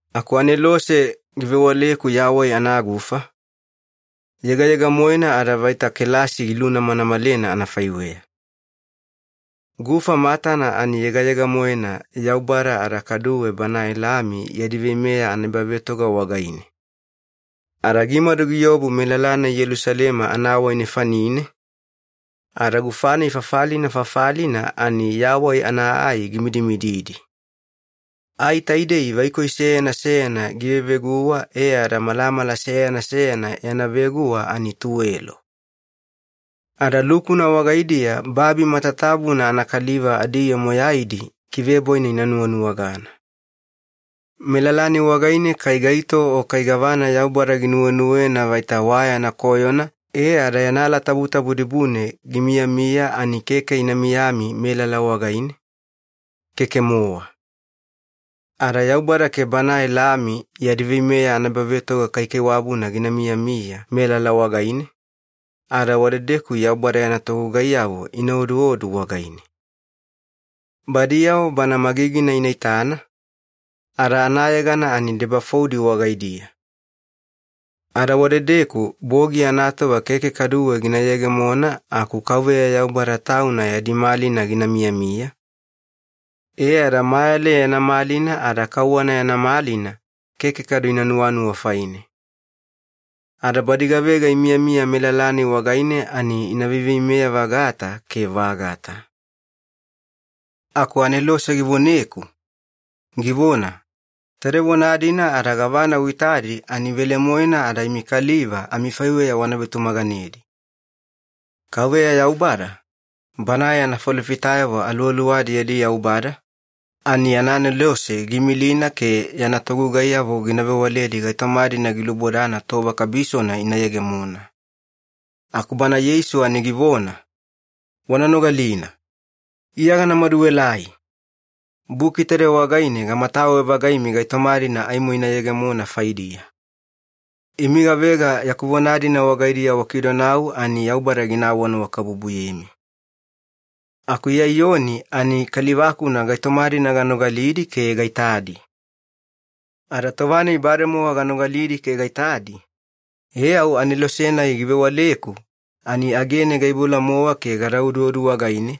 Aku anelose givewaleku yawai anagufa, yegayega-moena ada vaita kelasi gilunamanamalena anafaiweya. Gufa matana ani giyegeyegemona Yaubada ada kaduwe Banae Lami yadi veimeya anaebavetoga wagaine. Ada gimadu giobu melala-nai Yelusalema anawai nefanine, ada gufa-nai fafalina fafalina ani yawai ana ai gimidimididi. Ai taidei vaikoi seyana seyana giveveguwa e ada malamala seyana seyana yana veguwa ani tuwelo. Ada lukuna wagaidiya babi matatabuna anakaliva adiyoo moyaidi kivebwaina ina nuwanuwagana. Melala-nai wagaine kai gaito o kai gavana Yaubada ginuwenuwena vaita wa yana koyona e ada yana alatabutabu dibune gimiyamiya, ani keke ina miyami melala wagaine, keke-mowa. Ada Yaubada ke Banae Lami yadi veimeya anaebavetoga kaikaiwabuna gina miyamiya melala wagaine, ada wadedeku Yaubada yana togugaiyavo ina oduodu wagaine. Badiyavo Bana magigina ina itana, ada anayegana ani debafoudi wagaidiya. Ada wadedeku bogi anatova keke kaduwe gina yegemona aku Kauveya Yaubada Tauna yadi malina gina miyamiya, e ada mayale yana malina ada kauwana yana malina keke kadu ina nuwanuwa faine. Ada badi gavega imiyamiya melala-nai wagaine ani ina veiveimeya-vagata ke vagata. Aku anelose givoneku, givona, “Taide vona-dina ada gavana uitadi ani velemoena, ada imi kaliva amifaiweya wana vetumaganedi. Kauveya Yaubada, Banae yana falofitayavo aluwaluwadi yadi Yaubada, ani yana anelose giimilina ke yana togugaiyavo gina vewaledi gaitoma-dina gilubodana tova kabisona ina yegemona.” Aku Bana Yeisu ani givona, “Wana nogalina. Iya gana maduelai! Buki taide wagaine gamatawe-vagaimi gaitoma-dina aimo ina yegemona faidiya. Imi gavega yaku vona-dina wagaidiya wakidonau ani Yaubada gina awanuwakabubuyemi.” Aku Iya Iyoni ani kaliva-kuna gaitoma-dina ganogalidi ke gaitadi. Ada tova-nai bademowa ganogalidi ke gaitadi, e au anelose-nai givewaleku ani agene gaiboula-mowa ke gada oduodu wagaine,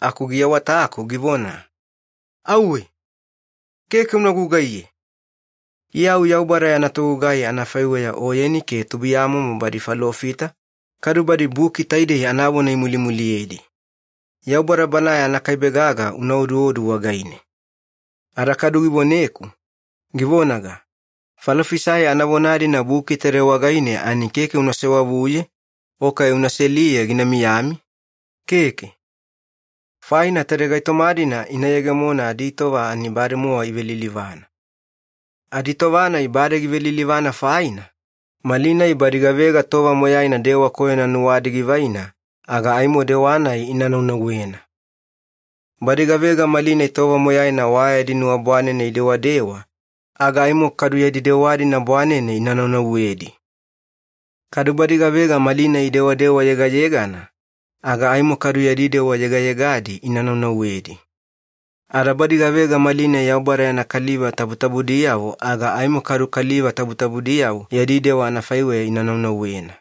aku giawataku givona, “Auwe! Keke una gugaiye! Iya au Yaubada yana togugai anafaiweya oyeni ke tubuiyamomo badi falofita, kadu badi buki taidei anavona imulimuliyedi. Yaubada Banae anakaibe gaga una oduodu wagaine.” Ada kadu givoneku, givonaga, “Falofisai anavona-dina buki taide wagaine, ani keke una sewavuye o kai una seliye gina miyami, keke. Faina taide gaitoma-dina ina yegemona aditova ani bademowa ivelilivana. Aditova-nai bade givelilivana faina, malinai badi gavega tova moyaina dewa koyona nuwadi givaina, aga aimo dewa-nai ina naunauwena. Badi gavega malinai tova moyaina wa yadi nuwa bwanene idewadewa, aga aimo kadu yadi dewa-dina bwanene ina naunauwedi. Kadu badi gavega malinai idewadewa yegayegana, aga aimo kadu yadi dewa yegayegadi ina naunauwedi. Ada badi gavega malinai Yaubada yana kaliva tabutabudiyavo, aga aimo kadu kaliva tabutabudiyavo yadi dewa anafaiweya ina naunauwena.”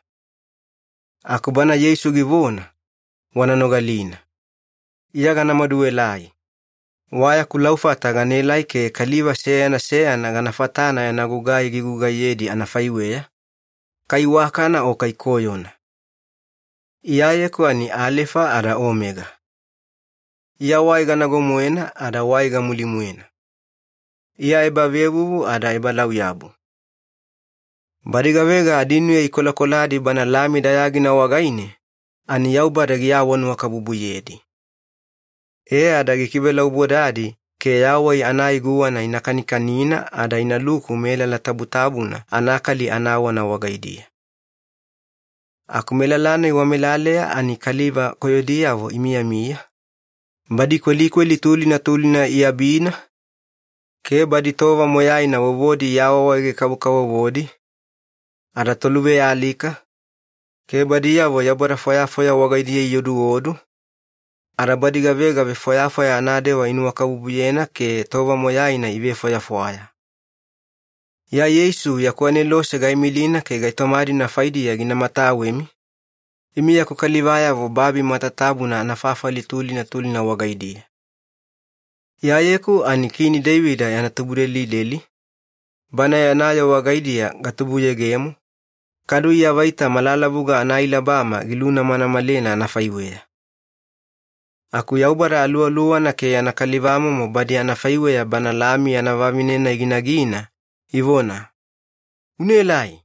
Aku Bana Yeisu givona, “Wana nogalina. Iya gana maduelai. Wa yaku laufata ganaelai ke kaliva seyana seyana gana fatana yana gugai gigugaiyedi anafaiweya, kai iwakana o kai koyona. Iyayeku ani Alefa ada Omega. Iya wai ganago-moena ada wai gamuli-moena. Iya ebavevuvu ada ebalauyabu.” Badi gavega adinuya ikolakoladi Bana Lami dayagina wagaine, ani Yaubada giawanuwakabubuyedi. E ada gikivelaubodadi ke yawai ana ai guwana ina kanikanina ada inaluku melala tabutabuna anakali anawana wagaidiya. Aku melala-nai wamelaleya ani kaliva koyodiyavo imiyamiya, badi kwelikweli tulina tulina iabina, ke badi tova moyaina vovodi iawaawaege-kavokavovodi, ada toluvealika, ke badiyavo yaubada fwayafwaya wagaidiya ioduodu, ada badi gavega vefwayafwaya anadewa inuwakabubuyena ke tova moyaina ivefwayafwaya. “Iya Yeisu yaku anelose gaimilina ke gaitoma-dina faidiya gina matawemi, imi yaku kalivayavo babi matatabuna anafafali tulina tulina wagaidiya. Iyayeku ani Kini Deivida yana tubudelideli, bana yana yoo wagaidiya gatubuyegemo, kadu Iya vaita malalavuga anaailabama gilunamanamalena anafaiweya.” Aku Yaubada Aluwaluwana ke yana kalivamomo badi anafaiweya Bana Lami yana vavine-nai ginagina ivona, “Unaelai!”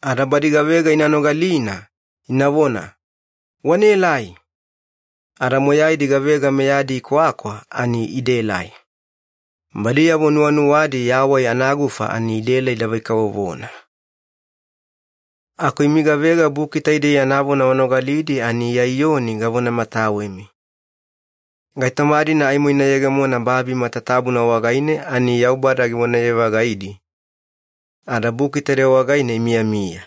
Ada badi gavega ina nogalina, inavona, “Wanaelai!” Ada moyaidi gavega meyadi ikwakwa ani idaelai. Badiyavo nuwanuwadi yawai anagufa ani idaela idavai-kavovona. Aku imi gavega buki taidei yana vona wanogalidi ani Iya Iyoni gavonamatawemi. Gaitoma-dina aimo ina yegemona babi matatabuna wagaine ani Yaubada givonaye-vagaidi, ada buki taide wagaine imiyamiya.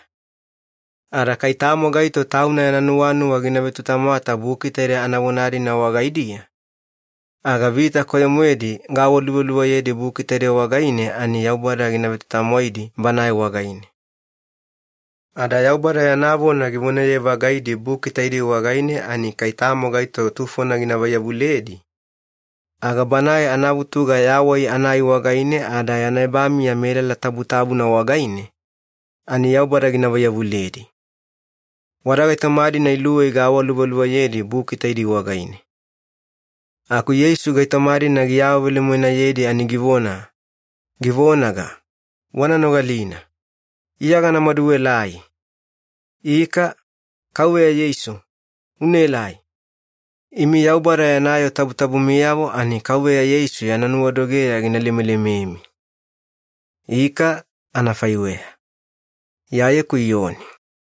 Ada kai tamo gaito tauna yana nuwanuwa gina vetutamwata buki taide anavona-dina wagaidiya, aga vita koyo-moedi gaawaluvaluvayedi buki taide wagaine ani Yaubada gina vetutamwaidi banae wagaine. Ada Yaubada yana vona givonaye-vagaidi buki taidei wagaine ani kai tamo gaito tufona gina vaiyavuledi, aga banae anavutuga yawai ana ai wagaine ada yana ebamiya melala tabutabuna wagaine, ani Yaubada gina vaiyavuledi. Wada gaitoma-dina iluwei gaawaluvaluvayedi buki taidei wagaine. Aku Yeisu gaitoma-dina giawavelemoenayedi ani givona, givonaga, “Wana nogalina. Iya gana maduelai!” Ika, Kauveya Yeisu, unaelai! Imi Yaubada yana yoo tabutabumiyavo ani Kauveya Yeisu yana nuwadogeya gina lemelememi. Ika, anafaiweya. Iyayeku Iyoni